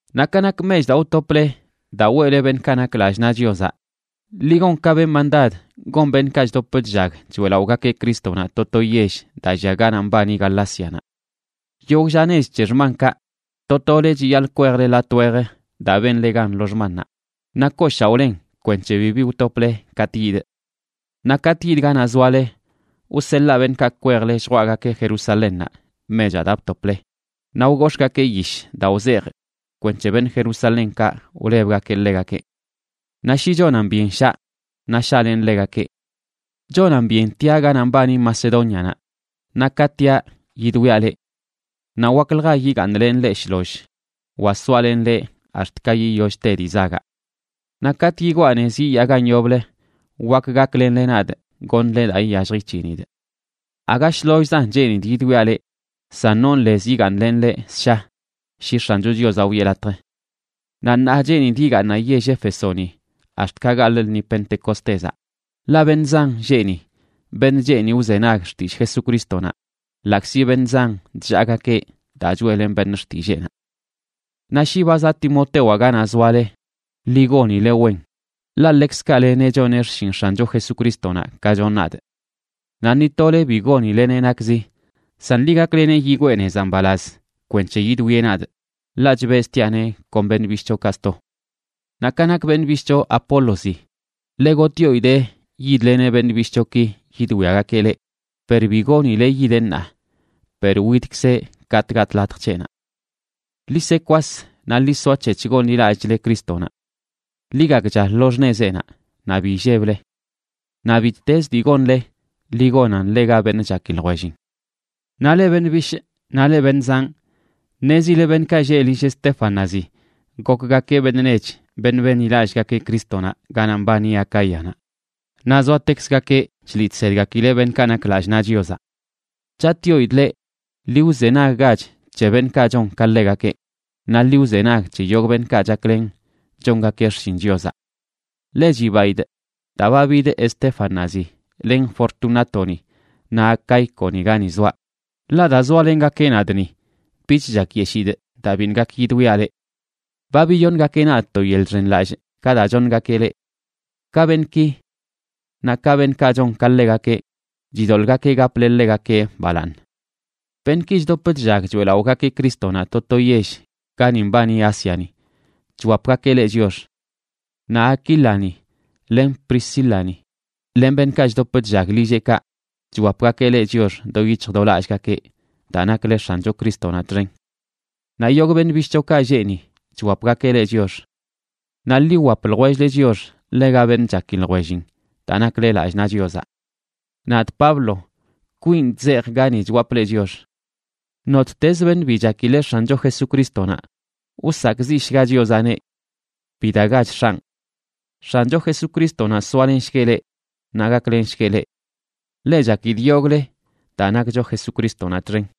Naꞌ ka nak mech daa wtople daa weꞌle beṉꞌkaꞌ nak lallꞌ naꞌ Chiozaꞌ, ḻi gon ka benꞌ mandad gon beṉꞌkaꞌ chdop chllag choeꞌlaꞌogakeꞌ Crístonaꞌ to to yell daa llia ganaꞌ mbani Galácianaꞌ. Yogꞌ lla nech c̱he xmankaꞌ, to tole chiyaḻꞌ kwejle latꞌ wej daa benle gan lo xmannaꞌ naꞌ kooshaoꞌlen kwenc̱he bibi wtople katꞌ yidꞌ. Naꞌ katꞌ yidꞌ ganaꞌ zoale, wseḻaa beṉꞌkaꞌ kwejle lljwaꞌgakeꞌ Jerusalénnaꞌ mechaꞌ daa btople, naꞌ wgox̱ꞌgakee yish daa wzejꞌ kwenc̱he beṉꞌ Jerusalénkaꞌ wlebgakeꞌ ḻegakeꞌ. Naꞌ shi chonan byen shaa, naꞌ shaꞌlenꞌ ḻegakeꞌ. Chonan byen tiaꞌ ganaꞌ mbani Macedónianaꞌ, naꞌ ka tiaꞌ, yidwiaꞌ leꞌ. Naꞌ waklja yigaaṉlenꞌ leꞌ shloll wa soalenꞌ leꞌ ax̱t ka yiyollch te dii zagaꞌ. Naꞌ katꞌ yigwaa nez yiyaa gan yoblə wak gaklenle nadꞌ goṉle daa iyallj ic̱hinidꞌ. Aga shlollzan cheenidꞌ yidwiaꞌ leꞌ, san non lez yigaaṉlenꞌ leꞌ ssha, shi X̱ancho Chiozaꞌ wiꞌe latj. Naꞌ ṉaa cheenidꞌ yigaaṉaꞌ yell Éfesoni ax̱t ka gaḻꞌ lṉi Pentecostézaꞌ, ḻaꞌ beṉꞌ zan lleꞌ ni, beṉꞌ cheeni wzenag xtillꞌ Jesucrístonaꞌ, ḻaꞌkzi beṉꞌ zan chllaagakeꞌ daa choeꞌlenꞌ beṉꞌ xtilleenaꞌ. Naꞌ shi ba zaꞌ Timotewaꞌ ganaꞌ zoale, ḻi gonile wen, ḻaꞌ ḻekzkaꞌ leneꞌ choneꞌ xshin X̱ancho Jesucrístonaꞌ ka chonꞌ nadꞌ. Naꞌ ni tole bi gonileneꞌ nakzi, san ḻi gakleneꞌ yigwee nezaꞌ mbalaz kwenc̱he yidwieꞌ nadꞌ, ḻaꞌ chbeztiaꞌneꞌ kon beṉꞌ bishꞌchokaꞌ sto. Naꞌ ka nak beṉꞌ bishꞌcho Apólozi, ḻe gotꞌyoidee yidleneꞌ beṉꞌ bishꞌchoki yidwiagakeꞌ leꞌ, per bi goonileꞌ yideꞌ ṉaa, per widkzeꞌ katꞌ gatꞌ latj c̱heꞌnaꞌ. Ḻi se kwas naꞌ ḻi soac̱hec̱h gonḻilallꞌchle Crístonaꞌ. Ḻi gakcha lo xṉezeꞌnaꞌ naꞌ bi illeble. Naꞌ bittezə dii gonle, ḻi gonan ḻega beṉꞌ chaki ljwellin. Naꞌ leꞌ beṉꞌ bishꞌ naꞌ leꞌ beṉꞌ zanꞌ, ṉezile beṉꞌkaꞌ lleꞌ lill Estéfanazi gokgakeꞌ beṉꞌ nech beṉꞌ benḻilallꞌgakeꞌ Crístonaꞌ ganaꞌ mbani Acáyanaꞌ, naꞌ zoatekzgakeꞌ chliꞌ chsedgakileꞌ beṉꞌkaꞌ nak lallꞌ naꞌ Chiozaꞌ. Chatꞌyoidꞌ leꞌ, ḻi wzenaggach c̱he beṉꞌkaꞌ chon ka ḻegakeꞌ, naꞌ ḻi wzenag c̱he yogꞌ beṉꞌkaꞌ chaklen chongakeꞌ xshin Chiozaꞌ. Ḻe chibaidꞌ daa ba bid Estéfanazi len Fortunátoni naꞌ Acaíconi gani zoaꞌ, ḻaꞌ daa zoalengakeꞌ nadꞌ ni, bich chakyeshidꞌ daa biṉꞌ gak yidwiaꞌ leꞌ. Ba biyoṉgakeꞌ nadꞌ to yeḻꞌ chxenlallꞌ ka daa choṉgakeꞌ leꞌ. Ka beṉꞌki naꞌ ka beṉꞌkaꞌ chon ka ḻegakeꞌ, chidoḻꞌgakeꞌ gaple ḻegakeꞌ balaaṉ. Beṉꞌki chdop chllag choeꞌlaꞌogakeꞌ Crístonaꞌ to to yell gani mbani Ásiani chwapgakeꞌ leꞌ chiox. Naꞌ Aquílani len Priscílani, len beṉꞌkaꞌ chdop chllag lilleꞌkaꞌ chwapgakeꞌ leꞌ chiox do yic̱hj do lallꞌgakeꞌ daa nakle X̱ancho Crístonaꞌ txen. Naꞌ yogꞌ beṉꞌ bishꞌchokaꞌ lleꞌ ni chwapgakeꞌ leꞌ chiox. Naꞌ ḻi wwap ljwell-le chiox ḻega beṉꞌ chaki ljwellin daa nakle lallꞌ naꞌ Chiozaꞌ. Nadꞌ, Pablo, kwinꞌ chzejꞌa gani chwapꞌ leꞌ chiox. Nottezə beṉꞌ bi chakileꞌ X̱ancho Jesucrístonaꞌ, wsakꞌziꞌshga Chiozaꞌneꞌ. ¡Bidagach X̱anꞌ! X̱ancho Jesucrístonaꞌ soalenshgueꞌ leꞌ naꞌ gaklenshgueꞌ leꞌ. Ḻe chakidꞌ yogꞌle daa nakcho Jesucrístonaꞌ txen.